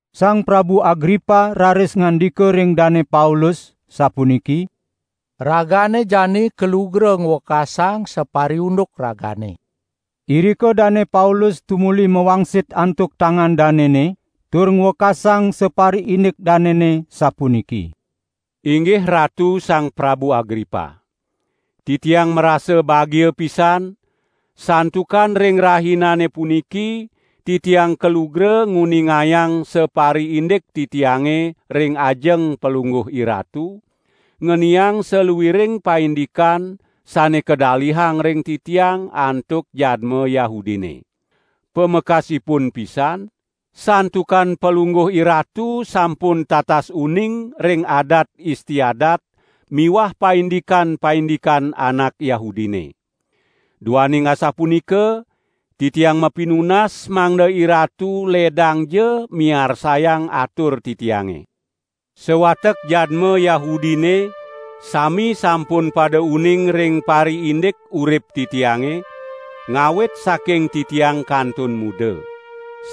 Sang Prabu Agripa raris ngandika ring Dane Paulus, sapuniki: "Ragane jani kalugra ngwekasang sapariunduk ragane." Irika Dane Paulus tumuli mawangsit antuk tangan danene tur ngwekasang sapariindik danene sapuniki: "Inggih Ratu Sang Prabu Agripa! Titiang marasa bagia pisan, santukan ring rahinane puniki titiang kalugra nguningayang sapariindik titiange ring ajeng palungguh iratu, ngeniang saluiring paindikan sane kadalihang ring titiang antuk jadma Yahudine. Pamekasipun pisan, santukan palungguh iratu sampun tatas uning ring adat istiadat miwah paindikan-paindikan anak Yahudine. Duaning asapunika, titiang mapinunas mangda iratu ledangja miarsayang atur titiange. Sawatek jadma Yahudine sami sampun pada uning ring pariindik urip titiange, ngawit saking titiang kantun muda.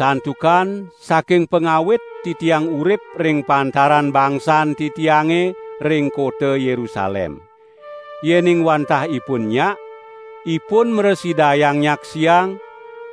Santukan saking pangawit titiang urip ring pantaran bangsan titiange ring kota Yerusalem. Yening wantah ipun nyak, ipun mrasidayang nyaksiang,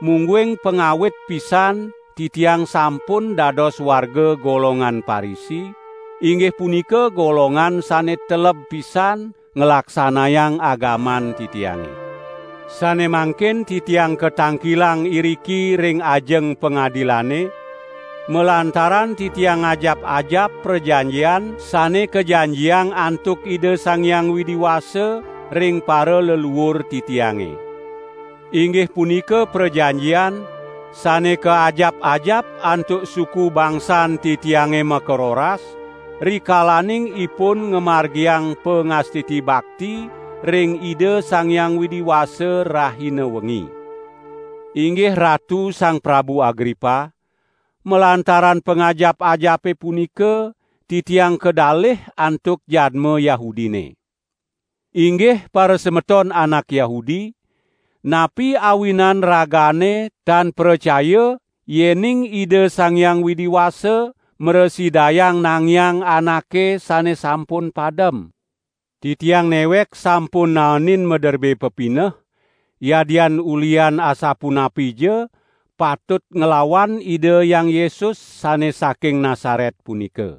mungguing pangawit pisan titiang sampun dados warga golongan Parisi, inggih punika golongan sane teleb pisan nglaksanayang agaman titiange. Sane mangkin titiang katangkilang iriki ring ajeng pangadilane, malantaran titiang ngajap-ajap prajanjian sane kajanjiang antuk Ida Sang Hyang Widi Wasa ring paraleluur titiange. Inggih punika prajanjian sane kaajap-ajap antuk suku bangsan titiange makaroras rikalaning ipun ngamargiang pangastiti bakti ring Ida Sang Hyang Widi Wasa rahina wengi. Inggih Ratu Sang Prabu Agripa, malantaran pangajap-ajape punika, titiang kadalih antuk jadma Yahudine. Inggih parasemeton anak Yahudi, napi awinan ragane tan pracaya yening Ida Sang Hyang Widi Wasa mrasidayang nangiang anake sane sampun padem? Titiang newek sampun naenin maderbe pepineh, yadian ulihan asapunapija, patut nglawan Ida Hyang Yesus sane saking Nasaret punika.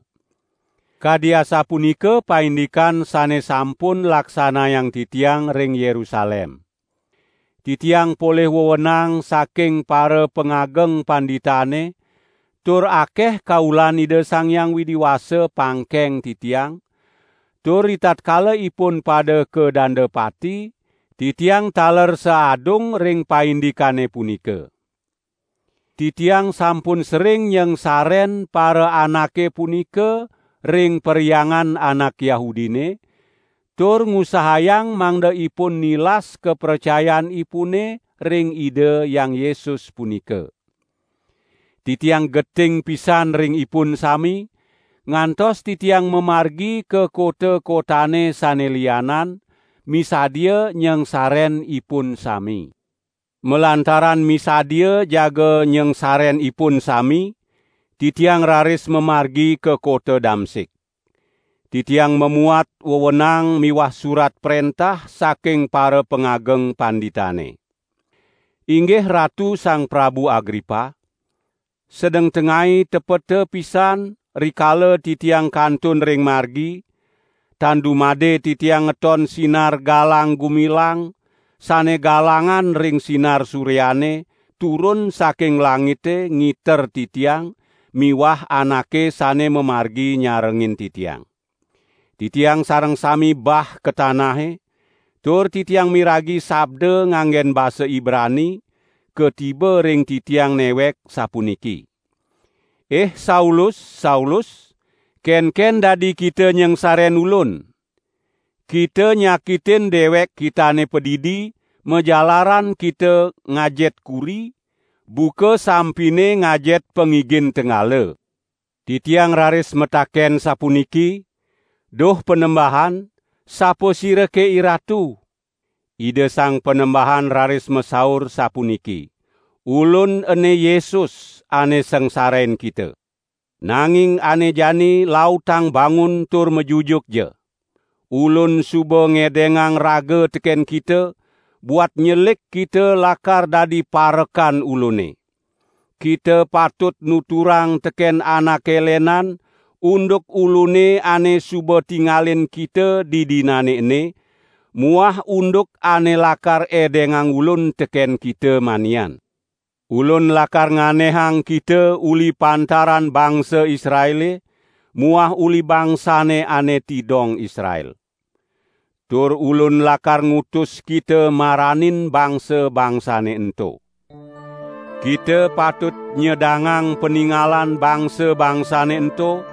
Kadi asapunika paindikan sane sampun laksanayang titiang ring Yerusalem. Titiang polih wewenang saking parapangageng panditane tur akeh kaulan Ida Sang Hyang Widi Wasa pangkeng titiang, tur ritatkala ipun pada kadanda pati, titiang taler saadung ring paindikane punika. Titiang sampun sering nyangsaren paraanake punika ring perhyangan anak Yahudine, tur ngusahayang mangda ipun nilas kapracayanipune ring Ida Hyang Yesus punika. Titiang geting pisan ring ipun sami, ngantos titiang mamargi ka kota-kotane sane lianan, misadia nyangsaren ipun sami." "Malantaran misadia jaga nyangsaren ipun sami, titiang raris mamargi ka kota Damsik. Titiang mamuat wewenang miwah surat prentah saking parapangageng panditane. Inggih Ratu Sang Prabu Agripa! Sedeng tengai tepeta pisan rikala titiang kantun ring margi, tan dumade titiang ngeton sinar galang-gumilang sane galangan ring sinar suryane turun saking langite ngiter titiang miwah anake sane mamargi nyarengin titiang. Titiang sareng sami bah ka tanahe, tur titiang miragi sabda nganggen basa Ibrani, katiba ring titiang newek sapuniki: 'Ih Saulus, Saulus, kenken dadi kita nyangsaren Ulun? Kita nyakitin dewek kitane padidi majalaran kita ngajet kuri, buka sampine ngajet pangigin tenggala.' Titiang raris mataken sapuniki: 'Duh Panembahan, sapasirake IRatu?' Ida Sang Panembahan raris masaur sapuniki: 'Ulun ene Yesus, ane sangsarain kita. Nanging ane jani lautang bangun tur majujukja. Ulun suba ngedengang raga teken kita, buat nyelik kita lakar dadi parekan Ulune. Kita patut nuturang teken anake lenan unduk Ulune ane suba tingalin kita didinane ene, muah unduk ane lakar edengang Ulun teken kita manian. Ulun lakar nganehang kita uli pantaran bangsa Israele muah uli bangsane ane tidong Israel. Tur Ulun lakar ngutus kita maranin bangsa-bangsane ento. Kita patut nyedangang paningalan bangsa-bangsane ento,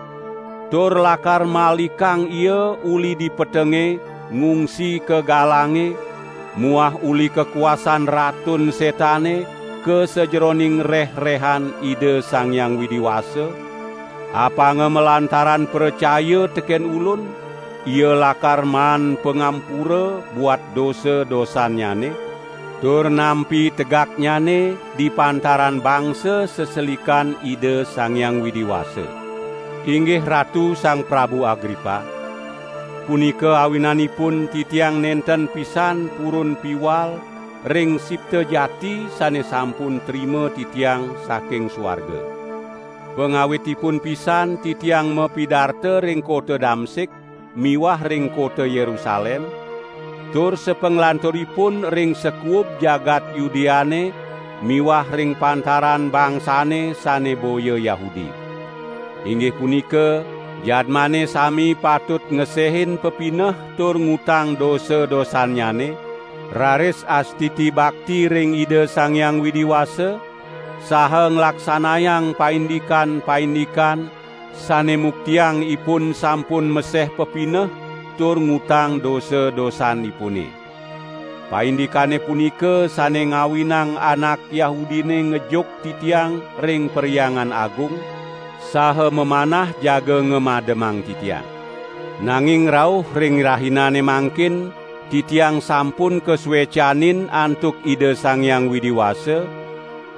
tur lakar malikang ia uli di petenge ngungsi ka galange muah uli kakuasan Ratun Setane ka sajeroning rehrehan Ida Sang Hyang Widi Wasa, apanga malantaran pracaya teken Ulun, ia lakar maan pangampura buat dosa-dosannyane, tur nampi tegaknyane di pantaran bangsa seselikan Ida Sang Hyang Widi Wasa.' " "Inggih Ratu Sang Prabu Agripa! Punika awinanipun titiang nenten pisan purun piwal ring sipta jati sane sampun trima titiang saking suarga. Pangawitipun pisan titiang mapidarta ring kota Damsik miwah ring kota Yerusalem, tur sapanglanturipun ring sakuub jagat Yudeane miwah ring pantaran bangsane sane boya Yahudi. Inggih punika, jadmane sami patut ngesehin pepineh tur ngutang dosa-dosannyane raris astiti bakti ring Ida Sang Hyang Widi Wasa, saha nglaksanayang paindikan-paindikan sane muktiang ipun sampun meseh pepineh tur ngutang dosa-dosanipune. Paindikane punika sane ngawinang anak Yahudine ngejuk titiang ring Perhyangan Agung, saha mamanah jaga ngamademang titiang. Nanging rauh ring rahinane mangkin titiang sampun kasuecanin antuk Ida Sang Hyang Widi Wasa,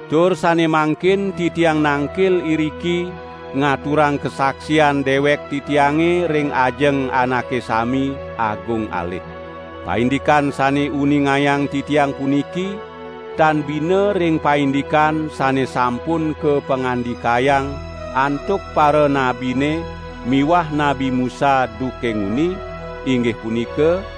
tur sane mangkin titiang nangkil iriki ngaturang kasaksian dewek titiange ring ajeng anake sami, agung alit. Paindikan sane uningayang titiang puniki, tan bina ring paindikan sane sampun kapangandikayang antuk paranabine miwah Nabi Musa duke nguni, inggih punika: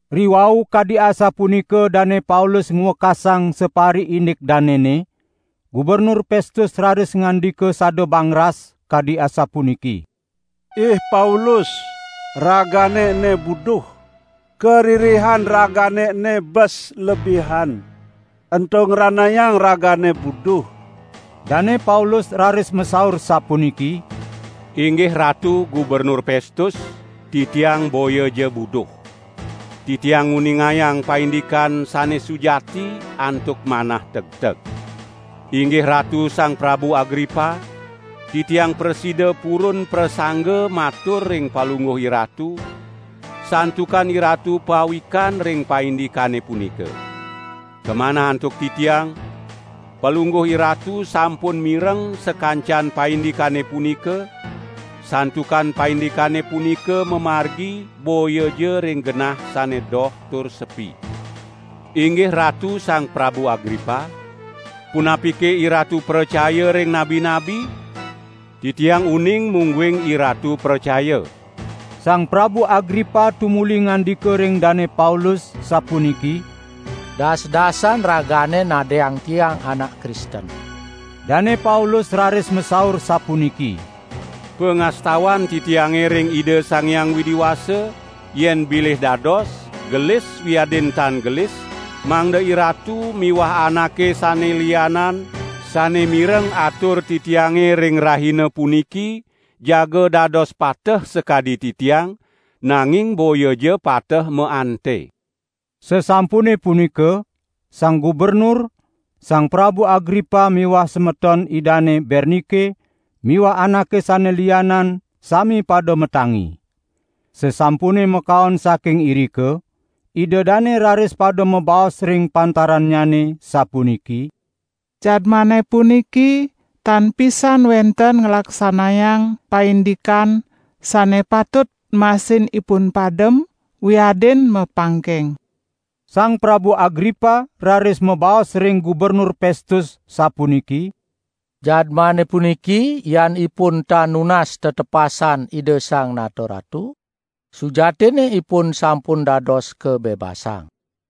Riwau kadi asapunika Dane Paulus ngwekasang sapariindik danene, Gubernur Pestus raris ngandika sada bangras, kadi asapuniki: "Ih Paulus ragane ene buduh! Karirihan ragane ene bes lebihan, ento ngranayang ragane buduh!" Dane Paulus raris masaur sapuniki: "Inggih Ratu Gubernur Pestus, titiang boyaja buduh. Titiang nguningayang paindikan sane sujati antuk manah tegteg. Inggih Ratu Sang Prabu Agripa! Titiang prasida purun prasangga matur ring palungguh iratu, santukan iratu pawikan ring paindikane punika. Kamanah antuk titiang, palungguh iratu sampun mireng sakancan paindikane punika, santukan paindikane punika mamargi boyaja ring genah sane doh tur sepi. Inggih ratu Sang Prabu Agripa! Punapike iratu pracaya ring nabi-nabi? Titiang uning mungguing iratu pracaya!" Sang Prabu Agripa tumuli ngandika ring Dane Paulus sapuniki: "Das-dasan ragane nadiang tiang anak Kristen." Dane Paulus raris masaur sapuniki: "Pangastawan titiange ring Ida Sang Hyang Widi Wasa, yen bilih dados, gelis wiadin tan gelis, mangda iratu miwah anake sane lianan sane mireng atur titiange ring rahina puniki jaga dados pateh sakadi titiang, nanging boyaja pateh maante." Sasampune punika sang gubernur, Sang Prabu Agripa miwah semeton idane Bernike miwah anake sane lianan sami pada matangi. Sasampune makaon saking irika ida dane raris pada mabaos ring pantarannyane sapuniki: "Jadmane puniki tan pisan wenten nglaksanayang paindikan sane patut masin ipun padem wiadin mapangkeng." Sang Prabu Agripa raris mabaos ring Gubernur Pestus, sapuniki: "Jadmane puniki yan ipun tan nunas tetepasan Ida Sang Nata Ratu, sujatinne ipun sampun dados kabebasang."